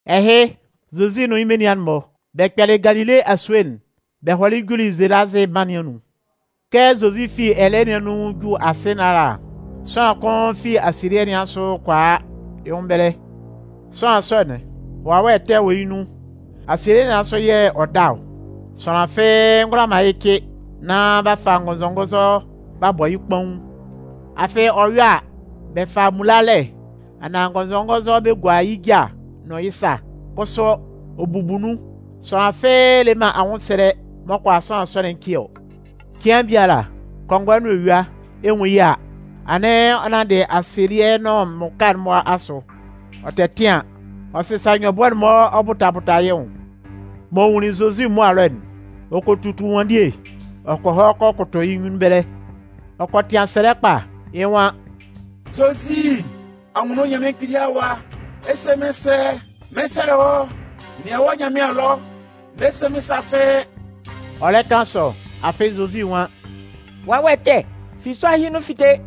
Ɛhɩ, Zozi nʋn yɩ́ menian'n-mɔ, bɛ kpɛlɩ Galile asue'n bɛ hɔlɩ juli Zelazɩ mân nɩn anun. Kɛ Zozi fi ɛlɛɛ nɩn anun 'ju asɩ nɩn ala, sʋanlan kʋn fi asielɩɛ nɩn asʋ kɔ a yɩ́ nwʋn ɛbɛlɛ. Sʋanlan sɔ'n, wawɛ ɛtɛ wɔ yɩ́ nun, asielɩɛ nɩn asʋ yɛ̂ ɔ da ɔ. Sʋanlan fɩ́ɩ́ ngʋala man yɩ́ cɩ, nán b'a fa ngɔnzɔngɔnzɔ b'a bɔ yɩ́ kpaun. Afɩ ɔ yɔ a, bɛ fa mmulalɛ anaan ngɔnzɔngɔnzɔ bɛ gua yɩ́ ja nʋn yɩ́ sa, kʋsʋ, ɔ bubu nun. Sʋanlan fɩ́ɩ́ le man anwʋnsɛlɛ m'ɔ kʋala sʋanlan sɔ'n cɩ ɔ. Cɩan biala, kɔngɔɛ nʋn eyua, ɛ 'nwun yɩ́ a, anɩn ɔ nanndɩ asielɩɛ'n nʋn mmʋka'n-mɔ asʋ, ɔ tɛtɩan, ɔ sɩsa nyɔbʋɛ'n-mɔ ɔ bʋta bʋta yɩ́ nwʋn. M'ɔ nwunlin Zozi mʋa ɛlɔ'n, ɔ kɔ tutu ɛnwanndie ɔ kɔ hɔ kɔ kʋtʋ yɩ́ nyunnun ɛbɛlɛ. Ɔ kɔ tɩan nun sɛlɛ kpa. Yɩ nwan: “Zozi, Anwunno Nyanmɩan Kpili Awa, ɛ 'se mɩ́n sɛ? Mɩn 'sɛlɛ wɔ́, nɩan wɔ́ Nyanmɩan ɛlɔ, n'ɛ se mɩ́n sa fɩ́ɩ́.” Ɔ lɛ kan sɔ, afɩ Zozi nwan: “Wawɛ ɛtɛ, fi sʋanlan ɛhɩ nun fite.”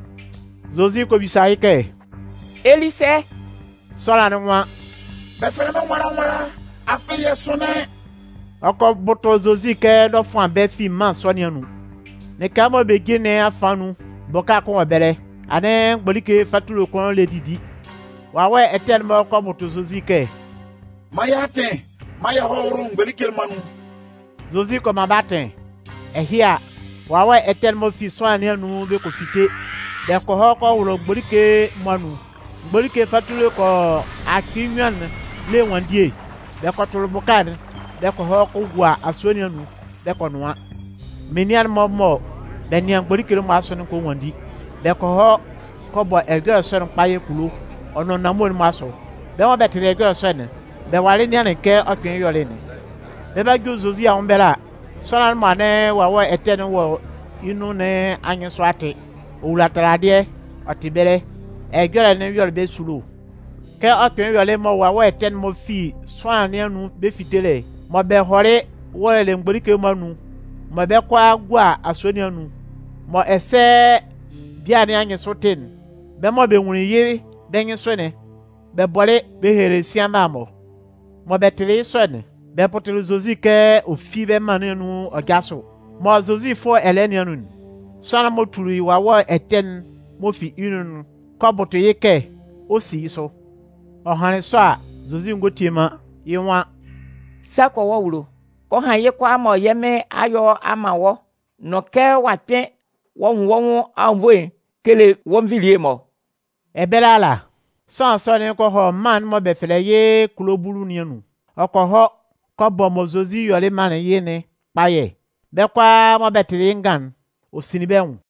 Zozi kɔ bisa yɩ́ kɛ: “Ɛ li sɛ?” Sʋanlan'n nwan: “Bɛ fɛlɛ mɩ́n nwala nwala, afɩ yɛ sʋnlɩn.” Ɔ kɔ bʋtʋ Zozi kɛ n'ɔ fʋan bɛ́ fi mân sɔ nɩn anun. Lɩka mɔ bɛ jin nɩn afan nun, bʋka kʋn anwʋn ɛbɛlɛ, anɩn mgbolike fatule kʋn lɛ didi. Wawɛ ɛtɛ'n-mɔ kɔ bʋtʋ Zozi kɛ: “Man yɛ́ atɩn maan yɛ hɔ́ wʋ́lʋ mgbolike'n-mɔ anun.” Zozi kɔ man bɛ́ atɩn. Ɛhɩ a, wawɛ ɛtɛ'n-mɔ fi sʋanlan nɩn anun bɛ kɔ fite, bɛ kɔ hɔ kɔ wʋlʋ mgbolike'n-mɔ anun. Mgbolike fatule kɔ yɔ akpɩɩ nnyuan'n le ɛnwanndie bɛ kɔ tʋlʋ bʋka'n bɛ kɔ hɔ kɔ gua asue nɩn anun, bɛ kɔ nʋan. Menian'n-mɔ mɔ bɛ nɩan mgbolike'n-mɔ asʋ'n kɔ nwanndi. Bɛ kɔ hɔ kɔ bɔ ɛjɔlɛ sɔ'n kpayɛ kulo, ɔ nʋn nanmue'n-mɔ asʋ. Bɛ́ mɔ bɛ tɩlɩ ɛjɔlɛ sɔ'n, bɛ walɩ nɩanlɩn kɛ ɔ kpɩnlɩn yɔlɩ yɩ́'n. Bɛ 'ba ju Zozi anwʋn ɛbɛlɛ a, sʋanlan'n mɔ anɩn wawɛ ɛtɛ'n-mɔ wɔ yɩ́ nun nɩn anyɩnsʋ a tɩ. Ɔ wula taladɩɛ ɔ tɩ ɛbɛlɛ. Ɛjɔlɛ'n yɔlɩ bɛ́ esulo. Kɛ ɔ kpɩnlɩn yɔlɩ mɔ wawɛ ɛtɛ'n-mɔ fi sʋanlan nɩn anun bɛ fitelɩ, mɔ bɛ hɔlɩ wʋlʋlɩ mgbolike'n-mɔ anun mɔ bɛ 'kɔ a gua asue nɩn anun, mɔ ɛsɛ bian nɩn anyɩnsʋ 'tɩ'n, bɛ́ mɔ bɛ nwunlin yɩ́ bɛ́ nyɩnsʋ'n, bɛ bɔlɩ bɛ helelɩ sian mma'n-mɔ. Mɔ bɛ tɩlɩ yɩ́ sɔ'n, bɛ bʋtʋlɩ Zozi kɛ ɔ fi bɛ́ mân nɩn anun ɔ jásʋ. Mɔ Zozi 'fʋ ɛlɛɛ nɩn anun'n, sʋanlan'n m'ɔ tuli wawɛ ɛtɛ'n-mɔ fi yɩ́ nun'n kɔ bʋtʋ yɩ́ kɛ ɔ 'si yɩ́ sʋ. Ɔ hanlɩn sɔ a, Zozi ngɔ tie man. Yɩ́ nwan: “Sa kɔ wɔ́ awulo, kɔ han yɩ́ kʋalaa mɔ yɛ́ Mɩn a yɔ a man wɔ́ nʋn kɛ ɔ'a kpɩn ɔ'a nwun wɔ́ nwʋn anwunnvoe'n kele wɔ́ nvilie'n-mɔ.” Ɛbɛlɛ ala, sʋanlan sɔ'n kɔ hɔ mân'n mɔ bɛ fɛlɛ yɩ́ Kulo Bulu nɩn anun. Ɔ kɔ hɔ kɔ bɔ mɔ Zozi yɔlɩ manlɩn yɩ́'n kpayɛ. Bɛ́ kʋalaa mɔ bɛ tɩlɩ yɩ́ ngan'n, ɔ sinlin bɛ́ nwʋn.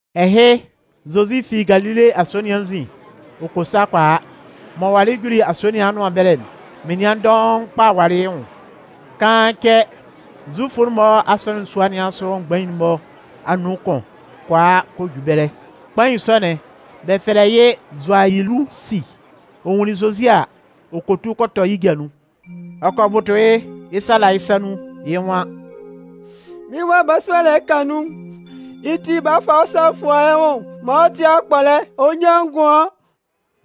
Ɛhɩ, Zozi fi Galile asue nɩn anzin ɔ kɔ sa kɔ a. M'ɔ walɩ juli asue nɩn anʋan ɛbɛlɛ'n, menian dɔʋn kpa walɩ yɩ́ nwʋn. Kaan cɛ, Zufu'n-mɔ asɔnɩn sua nɩn asʋ mgbain'n-mɔ anun kʋn kɔ a kɔ ju ɛbɛlɛ. Kpain sɔ'n bɛ fɛlɛ yɩ́ Zʋayilusi. Ɔ nwunlin Zozi a, ɔ kɔ tu kɔ tɔ yɩ́ ja nun. Ɔ kɔ bʋtʋ yɩ́, yɩ́ sa la yɩ́ sa nun, yɩ́ nwan: “Mɩ́n wa balasua'n lɛ ka nun, yɩ́ ti bala fa wɔ́ sa fua yɩ́ nwʋn maan ɔ tɩ́ akpɔlɛ ɔ nyán ngʋan.”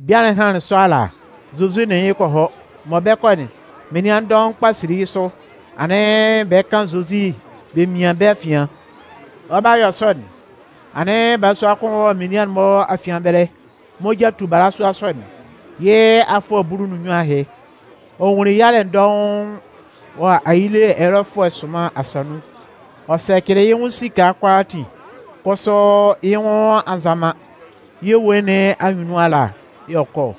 Bian'n hanlɩn sɔ ala, Zozi nʋn yɩ́ kɔ hɔ. Mɔ bɛ 'kɔ'n, menian dɔʋn kpa sili yɩ́ sʋ, anɩn bɛ 'kan Zozi bɛ mian bɛ́ afian. Ɔ 'ba yɔ sɔ'n, anɩn balasua kʋn wɔ menian'n-mɔ afian ɛbɛlɛ. Moja tu balasua sɔ'n, yɩ́ afʋɛ bulu nʋn nnyuan ahɩ. Ɔ nwunlin yalɛ dɔʋn wɔ ayile ɛyɔlɛfʋɛ sʋnman asa nun. Ɔ sɛcɩlɩ yɩ́ nwʋn esika kʋalaatin, kʋsʋ yɩ́ nwʋn a nza man. Yɩ́ ewue nɩn anyunnun ala yɛ̂ ɔ kɔ ɔ.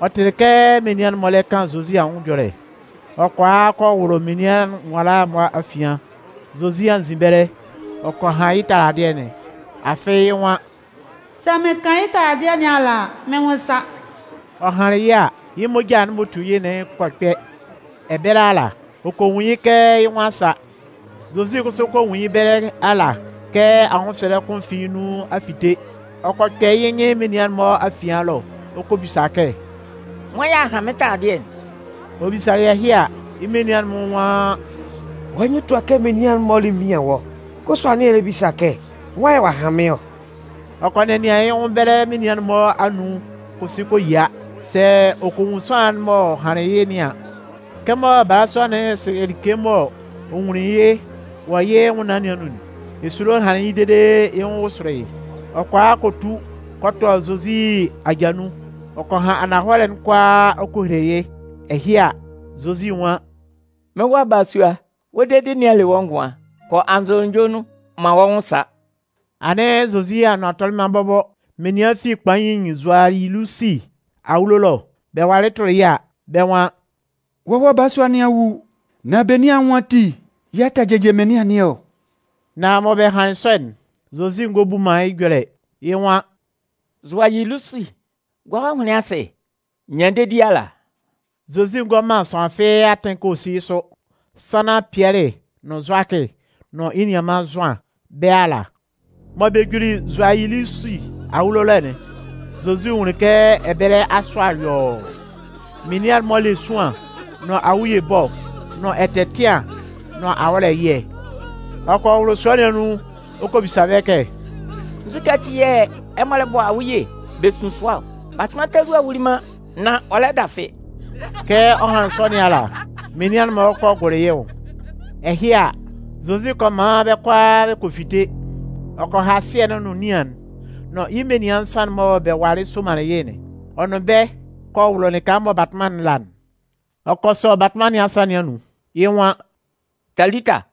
Ɔ tɩlɩ kɛ menian'n-mɔ lɛ kan Zozi anwʋn ɛjɔlɛ. Ɔ kɔ a kɔ wʋlʋ menian nwala'n mɔ afian, Zozi anzin ɛbɛlɛ, ɔ kɔ han yɩ́ taladɩɛ'n. Afɩ yɩ́ nwan: “Sɛ mɩn kan yɩ́ taladɩɛ nɩn ala a, mɩ́n nwʋn 'sa.” Ɔ hanlɩn yɩ́ a, yɩ́ moja'n m'ɔ tu yɩ́'n kɔ kpɛ. Ɛbɛlɛ ala, ɔ kɔ nwun yɩ́ kɛ yɩ́ nwʋn a sa. Zozi kʋsʋ kɔ nwun yɩ́ ɛbɛlɛ ala kɛ anwʋnsɛlɛ kʋn fi yɩ́ nun a fite. Ɔ kɔ kpɛ yɩ́ nyɩn menian'n-mɔ afian ɛlɔ ɔ kɔ bisa kɛ: “Nwan yɛ̂ ɔ'a han mɩ́n taladɩɛ'n?” Ɔ bisalɩ ɛhɩ a, yɩ́ menian'n-mɔ nwan: “Wɔ́ nyɩn tua kɛ menian'n-mɔ lɛ mian wɔ́, kʋsʋ anɩn ɛ lɛ bisa kɛ: Nwan yɛ̂ ɔ'a han mɩ́n ɔ?” Ɔ kɔ nɛnɩan yɩ́ nwʋn ɛbɛlɛ menian'n-mɔ anun kɔ si kɔ yia sɛ ɔ kɔ nwun sʋanlan'n m'ɔ hanlɩn yɩ́ nɩn an. Kɛmɔ balasua'n sɩ like m'ɔ nwunlɩn yɩ́ wɔ yɩ́ nwʋnnaan nɩn anun'n, esulo hanlɩn yɩ́ dede yɩ́ nwʋn wʋsʋlɩ yɩ́. Ɔ kɔ a kɔ tu kɔ tɔ Zozi aja nun, ɔ kɔ han ananhɔlɛ'n kʋalaa ɔ kɔ hele yɩ́. Ɛhɩ a, Zozi nwan: “Mɩ́n wa balasua, wɔ́ dedi nɩn a le wɔ́ ngʋan. Kɔ anzʋnunjɔ nun, man wɔ́ nwʋn sá.” Anɩn Zozi anʋan tɔlɩ man bɔbɔ, menian fi kpain Zʋayilusi awulo ɛlɔ bɛ walɩ tʋlɩ yɩ́ a, bɛ́ nwan: “Wɔ́ wa balasua nɩn a wu, nan benin anwʋn ati yɛ̂ ɛ tɛ jɩjɩ mɩnlɩan nɩn ɔ?” Nan mɔ bɛ hanlɩn sɔ'n, Zozi ngɔ bu man yɩ́ ɛjɔlɛ. Yɩ́ nwan: “Zʋayilusi, gua wɔ́ ahʋnlɩn asɩ, nyan dedi ala.” Zozi ngɔ man sʋanlan fɩ́ɩ́ atɩn kɛ ɔ sí yɩ́ sʋ, sannan Pɩɛlɩ nʋn Zʋakɩ nʋn yɩ́ nianman Zʋan, bɛ́ ala. Mɔ bɛ juli Zʋayilusi awulo ɛlɔ'n, Zozi nwunlin kɛ ɛbɛlɛ asʋa yɔɔ. Menian'n-mɔ le esuan nʋn awuye ɛbɔ nʋn ɛtɛtɩan nʋn awɔ́lɛ ɛyɩɛ. Ɔ kɔ wʋlʋ sua nɩn anun ɔ kɔ bisa bɛ́ kɛ: “Nzukɛ ati yɛ̂ ɛmɔ lɛ bɔ awuye bɛ sun sʋa ɔ? Batʋnman talua'n wuli man, nan ɔ lɛ dafɩ.” Kɛ ɔ hanlɩn sɔ nɩn ala, menian'n-mɔ kɔ gʋlʋ yɩ́ nwʋn. Ɛhɩ a, Zozi kɔ man bɛ́ kʋalaa bɛ kɔ fite, ɔ kɔ ha sɩɛ'n nʋn nian'n, nʋn yɩ́ menian nsan'n mɔ bɛ walɩ somanlɩn yɩ́'n. Ɔ nʋn bɛ́ kɔ wʋlʋ lɩka mɔ batʋnman'n la'n. Ɔ kɔ sɔ batʋnman nɩn asa nɩn anun, yɩ́ nwan: “Talita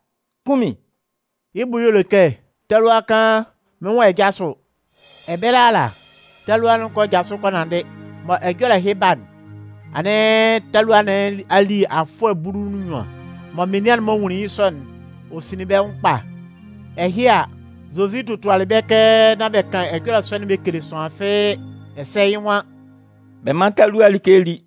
kunmin!” Yɩ́ bʋ y'ɔ le kɛ: “Talua kaan, mɩ́n nwan ɛ jásʋ!” Ɛbɛlɛ ala, talua'n kɔ jasʋ kɔ nanndɩ. Mɔ ɛjɔlɛ ɛhɩ 'ba'n, anɩn talua nɩn a li afʋɛ bulu nʋn nnyuan. Mɔ menian'n-mɔ nwunlin yɩ́ sɔ'n, ɔ sinlin bɛ́ nwʋn kpa. Ɛhɩ a, Zozi totualɩ bɛ́ kɛ nán bɛ kan ɛjɔlɛ sɔ'n bɛ kele sʋanlan fɩ́ɩ́. Ɛsɛ yɩ́ nwan: “Bɛ mán talua'n like lí.”